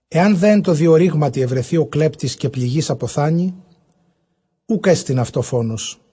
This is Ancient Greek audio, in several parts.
Ἐὰν δὲ ἐν τῷ διορύγματι εὑρεθῇ ὁ κλέπτης, καὶ πληγεὶς ἀποθάνῃ, οὐκ ἔστιν αὐτῷ φόνος.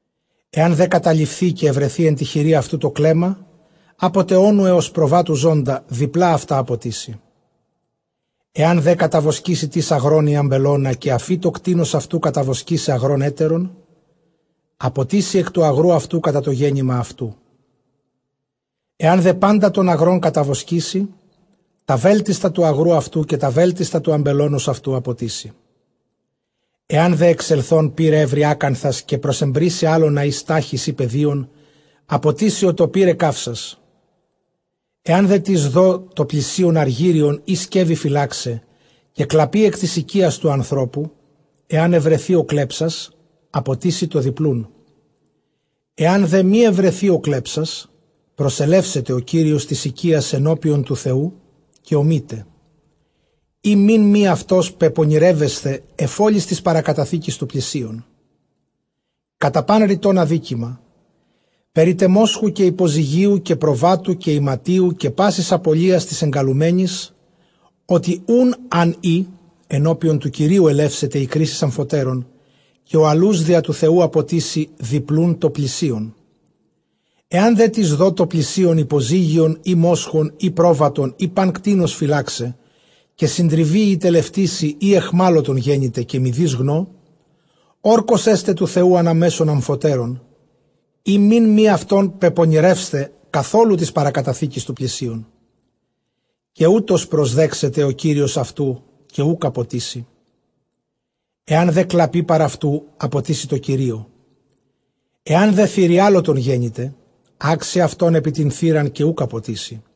Ἐὰν δὲ καταλειφθῇ καὶ εὑρεθῇ ἐν τῇ χειρὶ αὐτοῦ τὸ κλέμμα ἀπό τε ὄνου ἕως προβάτου ζῶντα, διπλᾶ αὐτὰ ἀποτίσει. Ἐὰν δὲ καταβοσκήσῃ τις ἀγρὸν ἢ ἀμπελῶνα, καὶ ἀφῇ τὸ κτῆνος αὐτοῦ καταβοσκῆσαι ἀγρὸν ἕτερον, ἀποτίσει ἐκ τοῦ ἀγροῦ αὐτοῦ κατὰ τὸ γέννημα αὐτοῦ· ἐὰν δὲ πάντα τὸν ἀγρὸν καταβοσκήσῃ, τὰ βέλτιστα τοῦ ἀγροῦ αὐτοῦ καὶ τὰ βέλτιστα τοῦ ἀμπελῶνος αὐτοῦ ἀποτίσει. Ἐὰν δὲ ἐξελθὸν πῦρ εὕρῃ ἀκάνθας, καὶ προσεμπρήσῃ ἅλωνας ἢ στάχυς ἢ πεδίον, ἀποτίσει ὁ τὸ πῦρ ἐκκαύσας. Ἐὰν δέ τις δῷ τῷ πλησίον ἀργύριον ἢ σκεύη φυλάξαι, καὶ κλαπῇ ἐκ τῆς οἰκίας τοῦ ἀνθρώπου, ἐὰν εὑρεθῇ ὁ κλέψας, ἀποτίσει τὸ διπλοῦν. Ἐὰν δὲ μὴ εὑρεθῇ ὁ κλέψας, προσελεύσεται ὁ κύριος τῆς οἰκίας ἐνώπιον τοῦ Θεοῦ, καὶ ὀμεῖται ἦ μὴν μὴ αὐτὸν πεπονηρεῦσθαι ἐφʼ ὅλης τῆς παρακαταθήκης τοῦ πλησίον, κατὰ πᾶν ῥητὸν ἀδίκημα, περί τε μόσχου, καὶ ὑποζυγίου, καὶ προβάτου, καὶ ἱματίου, καὶ πάσης ἀπωλίας τῆς ἐνκαλουμένης· ὅ, τι οὖν ἂν ᾖ, ἐνώπιον τοῦ Θεοῦ ἐλεύσεται ἡ κρίσις ἀμφοτέρων, καὶ ὁ ἁλοὺς διὰ τοῦ Θεοῦ, ἀποτίσει διπλοῦν τῷ πλησίον. Ἐὰν δέ τις δῷ τῷ πλησίον ὑποζύγιον ἢ μόσχον ἢ πρόβατον ἢ πᾶν κτῆνος φυλάξαι, καὶ συντριβῇ ἢ τελευτήσῃ ἢ αἰχμάλωτον γένηται, καὶ μηδεὶς γνῷ, ὅρκος ἔσται τοῦ Θεοῦ ἀνὰ μέσον ἀμφοτέρων, ἦ μὴν μὴ αὐτὸν πεπονηρεῦσθαι καθόλου τῆς παρακαταθήκης τοῦ πλησίον· καὶ οὕτως προσδέξεται ὁ κύριος αὐτοῦ, καὶ οὐκ ἀποτίσει. Ἐὰν δὲ κλαπῇ παρʼ αὐτοῦ, ἀποτίσει τῷ κυρίῳ· Ἐὰν δὲ θηριάλωτον γένηται, ἄξει αὐτὸν ἐπὶ τὴν θήραν, καὶ οὐκ ἀποτίσει.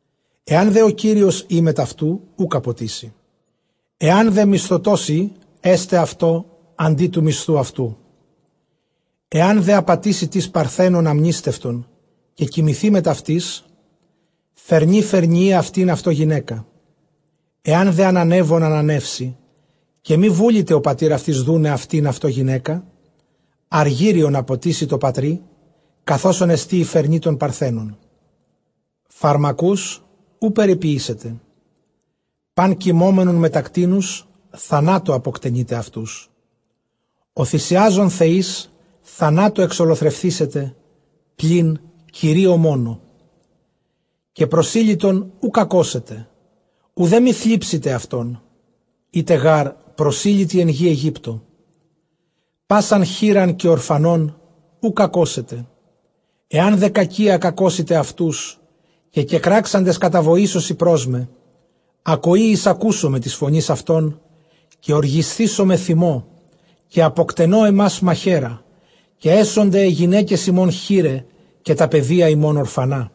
Ἐὰν δὲ ὁ κύριος ᾖ μετʼ αὐτοῦ, οὐκ ἀποτίσει· ἐὰν δὲ μισθωτὸς ᾖ, ἔσται αὐτῷ ἀντὶ τοῦ μισθοῦ αὐτοῦ. Ἐὰν δὲ ἀπατήσῃ τις παρθένον ἀμνήστευτον, καὶ κοιμηθῇ μετʼ αὐτῆς, φερνῇ φερνιεῖ αὐτὴν αὐτῷ γυναῖκα. Ἐὰν δὲ ἀνανεύων ἀνανεύσῃ, καὶ μὴ βούληται ὁ πατὴρ αὐτῆς δοῦναι αὐτὴν αὐτῷ γυναῖκα, ἀργύριον ἀποτίσει τῷ πατρὶ καθʼ ὅσον ἐστὶν ἡ φερνὴ τῶν παρθένων. Φαρμακοὺς οὐ περιποιήσετε. Πᾶν κοιμώμενον μετὰ κτήνους θανάτῳ ἀποκτενεῖτε αὐτούς. Ὁ θυσιάζων θεοῖς θανάτῳ ἐξολοθρευθήσεται, πλὴν Κυρίῳ μόνῳ. Καὶ προσήλυτον οὐ κακώσετε, οὐδὲ μὴ θλίψητε αὐτόν· ἦτε γάρ προσήλυτοι ἐν γῇ Αἰγύπτῳ. Πᾶσαν χήραν καὶ ὀρφανὸν οὐ κακώσετε. Ἐὰν δὲ κακίᾳ κακώσητε αὐτοὺς, καὶ κεκράξαντες καταβοήσωσι πρός με, ἀκοῇ εἰσακούσομαι τῆς φωνῆς αὐτῶν, καὶ ὀργισθήσομαι θυμῷ, καὶ ἀποκτενῶ ὑμᾶς μαχαίρᾳ, καὶ ἔσονται αἱ γυναῖκες ὑμῶν χῆραι, καὶ τὰ παιδία ὑμῶν ὀρφανά.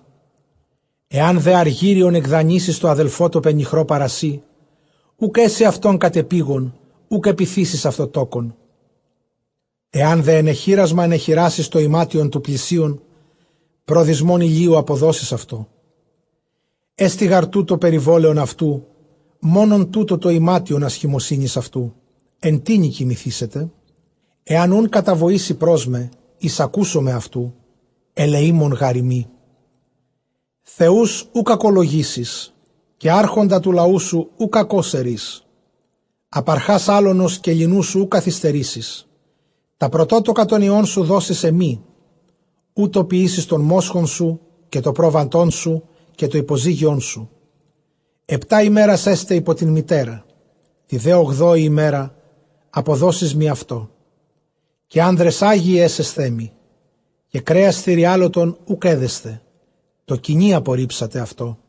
Ἐὰν δὲ ἀργύριον ἐκδανείσῃς τῷ ἀδελφῷ τῷ πενιχρῷ παρὰ σοὶ, οὐκ ἔσῃ αὐτὸν κατεπείγων, οὐκ ἐπιθήσεις αὐτῷ τόκον. Ἐὰν δὲ ἐνεχύρασμα ἐνεχυράσῃς τὸ ἱμάτιον τοῦ πλησίον, πρὸ δυσμῶν ἡλίου ἀποδώσεις αὐτῷ· Ἔστι γὰρ τοῦτο περιβόλαιον αὐτοῦ, μόνον τοῦτο τὸ ἱμάτιον ἀσχημοσύνης αὐτοῦ· ἐν τίνι κοιμηθήσεται; Ἐὰν οὖν καταβοήσῃ πρός μέ, εἰσακούσομαι αὐτοῦ· ἐλεήμων γάρ εἰμι. Θεοὺς οὐ κακολογήσεις, καὶ ἄρχοντα τοῦ λαοῦ σου οὐ κακῶς ἐρεῖς. Ἀπαρχὰς ἅλωνος καὶ ληνοῦ σου οὐ καθυστερήσεις· τὰ πρωτότοκα τῶν υἱῶν σου δώσεις ἐμοί. Οὕτω ποιήσεις τὸν μόσχον σου καὶ τὸ πρόβατόν σου καὶ τὸ ὑποζύγιόν σου· ἑπτὰ ἡμέρας ἔσται ὑπὸ τὴν μητέρα, τῇ δὲ ὀγδόῃ ἡμέρᾳ ἀποδώσεις μοι αὐτό. Καὶ ἄνδρες ἅγιοι ἔσεσθέ μοι· καὶ κρέας θηριάλωτον οὐκ ἔδεσθε, τῷ κυνὶ ἀποῤῥίψατε αὐτό.